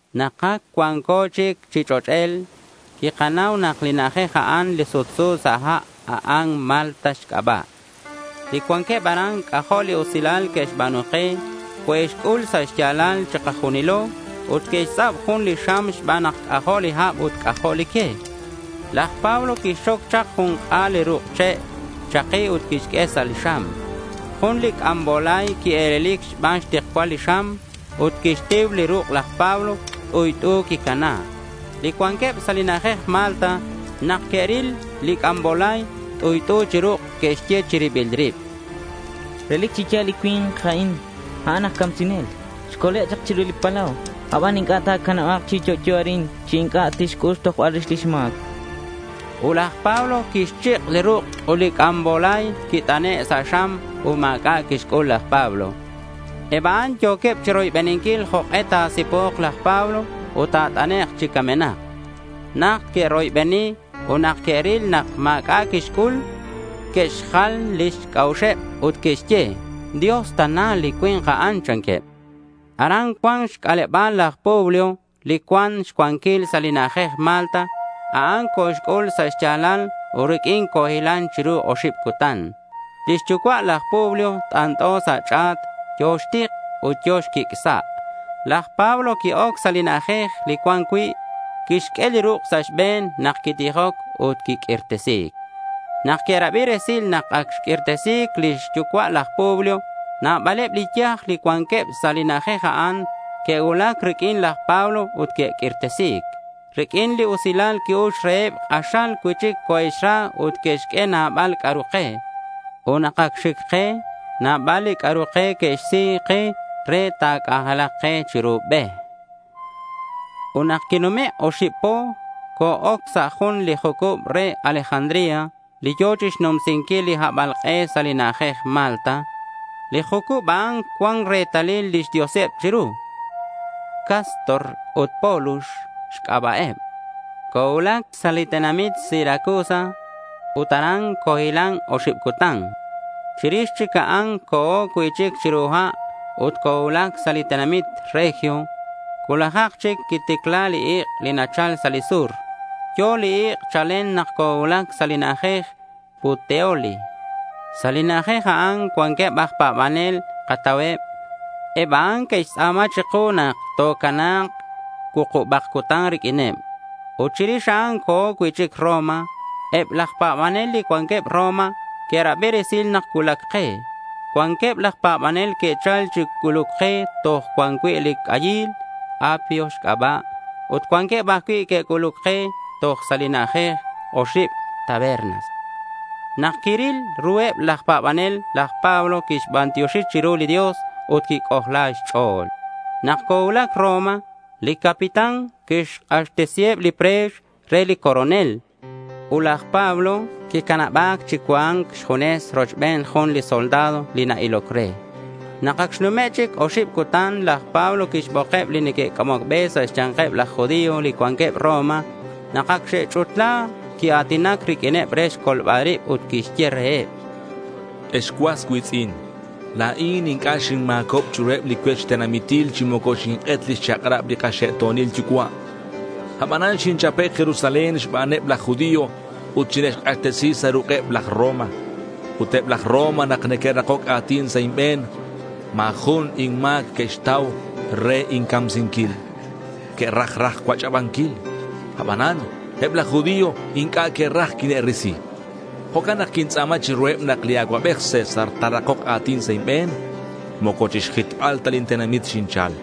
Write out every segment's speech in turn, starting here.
Nak ac cuanco chic chi ch'och'el, quikanau nak li na'ajej a'an, li sutsu sa' ha', a'an Malta xc'aba'. Li cuanqueb aran c'ajo' li usilal que'xba̱nu ke. Coe'xc'ul sa' xya̱lal chikajunilo ut que'xtz'ab jun xam xban nak c'ajo' li hab ut c'ajo' li que. Laj Pablo quixxoc chak jun k'a̱l li ruk' che' chaki ut quixq'ue sa' li xam. Jun li c'ambolay quie̱lelic xban xtikcual li xam ut quixtiu li ruk' laj Pablo. T'uyt'u quicana. Li cuanqueb sa' li na'ajej Malta, nak que'ril li c'ambolay t'uyt'u chi ruk', que'xye chi ribileb rib: —Relic chi ya̱l nak li cui̱nk a'in, a'an aj camsinel. Xcole' chak chiru li palau, abanan inc'a' ta̱canaba̱k chi yo'yo arin chi inc'a' tixc'ul xtojbal rix lix ma̱c, chanqueb. Ut laj Pablo quixchik' li ruk' ut li c'ambolay quit'ane' sa' xam ut ma̱c'a' quixc'ul laj Pablo. Eb a'an yo̱queb chiroybeninquil jok'e ta̱si̱po̱k laj Pablo ut ta̱t'anek' chi camenak. Najt que'roybeni ut nak que'ril nak ma̱c'a' quixc'ul, que'xjal lix c'a'uxeb ut que'xye: —Dios tana li cui̱nk a'an, chanqueb. Aran cuan xc'aleba̱l laj Publio li cuan xcuanquil sa' li na'ajej Malta. A'an coxc'ul sa' xya̱lal ut riq'uin cohilan chiru oxib cutan. Lix yucua' laj Publio t'ant'o sa' ch'a̱t. Yo̱ xtik ut yo̱ xquic' sa'. Laj Pablo qui-oc sa' li na'ajej li cuan cui'. Quixq'ue li ruk' sa' xbe̱n nak quitijoc ut quiq'uirtesi̱c. Nak que'rabi resil nak ac xq'uirtesi̱c lix yucua' laj Publio, nabaleb li yaj li cuanqueb sa' li na'ajej a'an, que'cuulac riq'uin laj Pablo ut que'q'uirtesi̱c. Riq'uin li usilal qui-ux reheb, k'axal cui'chic coe'xra ut que'xq'ue nabal c'a'ru ke. Ut nak ac xic ke nabal li c'a'ru ke que'xsi ke re ta̱c'anjelak ke chiru be. Ut nak quinume' oxib po, co-oc sa' jun li jucub re Alejandría li yo̱ chixnumsinquil li habalk'e sa' li na'ajej Malta. Li jucub a'an cuan retalil lix dioseb chiru. Cástor ut Pólux xc'aba'eb. Cocuulac sa' li tenamit Siracusa ut aran cohilan oxib cutan. Chirix chic a'an co̱o cui'chic chiru ha' ut cocuulac sa' li tenamit Regio. Cuulajak chic quiticla li ik' li nachal sa' li sur. Yo̱ li ik' chalen nak cocuulac sa' li na'ajej Puteoli. Sa' li na'ajej a'an cuanqueb aj pa̱banel katauheb. Eb a'an que'xtz'a̱ma chiku nak tocana̱k cuukubak cutan riq'uineb. Ut chirix a'an co̱o cui'chic Roma. Eb laj pa̱banel li cuanqueb Roma que'rabi resil nak cuulac ke. Cuanqueb laj pa̱banel que'chal chi c'uluc ke toj cuan cui' li c'ayil Apio xc'aba' ut cuanqueb ajcui' que'c'uluc ke toj sa' li na'ajej Oxib Tabernas. Nak quiril ruheb laj pa̱banel, laj Pablo quixbantioxi chiru li Dios ut quic'ojla xch'o̱l. Nak cocuulac Roma, li capitán quixk'axtesiheb li pre̱x re li coronel. Ut laj Pablo quicanaba̱c chi cua̱nc xjunes rochben jun li soldado li na-iloc re. Nak ac xnume' chic oxib cutan, laj Pablo quixbokeb li neque'c'amoc be sa' xya̱nkeb laj judío li cuanqueb Roma. Nak acak xe'ch'utla quia̱tinac riq'uineb re xcolbal rib, ut quixye reheb: —Ex cuas cui̱tz'in, la̱in inc'a' xinma̱cob chiruheb li cuech tenamitil chi moco xink'et lix chak'rabeb li kaxe'to̱nil yucua'. Abanan xinchape' Jerusalén xbaneb laj judío, ut xine'xk'axtesi sa' ruk'eb laj Roma. Ut eb laj Roma nak que'rakoc a̱tin sa' inbe̱n, ma̱ jun inma̱c que'xtau re incamsinquil. Que'raj raj cuach'abanquil. Abanan eb laj judío inc'a' que'raj quine'risi. Jo'can nak quintz'a̱ma chiruheb nak li acuabej César ta̱rakok a̱tin sa' inbe̱n. Moco chixjitbal ta lin tenamit xinchal.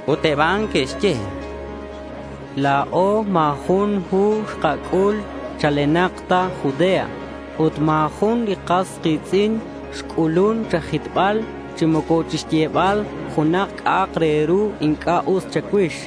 Ut eb a'an que'xye: —La̱o ma̱ jun hu xkac'ul chalenak ta Judea, ut ma̱ jun li kas ki̱tz'in xc'ulun cha̱jitbal chi moco chixyebal junak c'a'ak re ru inc'a' us cha̱cuix.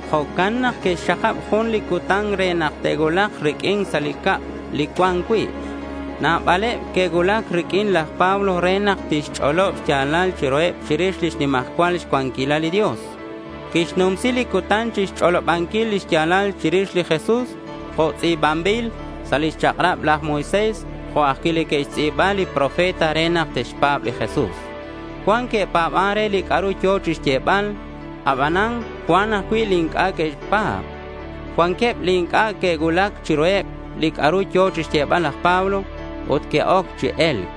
Jo'can nak que'xxakab jun li cutan re nak te'cuulak riq'uin sa' li cab li cuan cui'. Nabaleb que'cuulac riq'uin laj Pablo re nak tixch'olob xya̱lal chiruheb chirix lix nimajcual cuanquilal li Dios. Quixnumsi li cutan chixch'olobanquil li xya̱lal chirix li Jesús jo' tz'i̱banbil sa' lix chak'rab laj Moisés jo' ajcui' li que'xtz'i̱ba li profeta re nak te'xpa̱b li Jesús. Cuan que'pa̱ban re li c'a'ru yo̱ chixyebal. Abanan cuan ajcui' li inc'a' que'xpa̱b. Cuanqueb li inc'a' que'cuulac chiruheb li c'a'ru yo̱ chixyebal laj Pablo, ut que'oc chi e̱lc.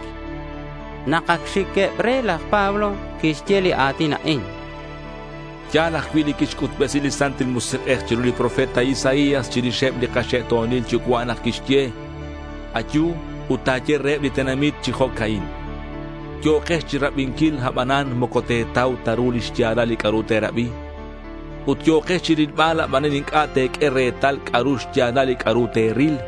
Nak ac xiqueb re, laj Pablo quixye li a̱tin a'in: —Ya̱l ajcui' li quixc'utbesi li Santil Musik'ej chiru li profeta Isaías chirixeb li kaxe'to̱nil yucua' nak quixye: Ayu ut ta̱ye reheb li tenamit chi jo'ca'in: Yo̱kex chirabinquil, abanan moco te̱tau ta ru lix ya̱lal li c'a'ru te̱rabi; ut yo̱kex chirilbal, abanan inc'a' te̱q'ue retal c'a'ru xya̱lal li c'a'ru te̱ril.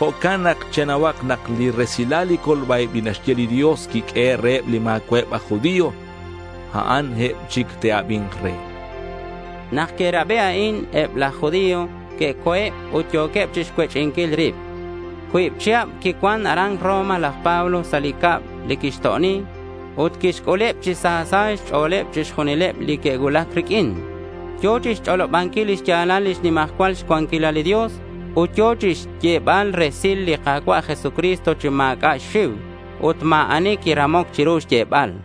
Jo'can nak chenauhak nak li resil li colba-ib li naxq'ue li Dios quiq'uehe' reheb li ma̱cua'eb aj judío. A'an eb chic te'abi̱nk re, chan laj Pablo. Nak que'rabi a'in, eb laj judío que'co̱eb ut yo̱queb chixcuech'inquil rib. Cuib chihab quicuan aran Roma laj Pablo sa' li cab li quixto'oni. Ut quixc'uleb chi sa sa' xch'o̱l chixjunileb li que'cuulac riq'uin. Yo̱ chixch'olobanquil lix ya̱lal lix nimajcual cuanquilal li Dios ut yo̱ chixyebal resil li Ka̱cua' Jesucristo chi ma̱c'a' xxiu. Ut ma̱ ani quiramoc chiru xyebal.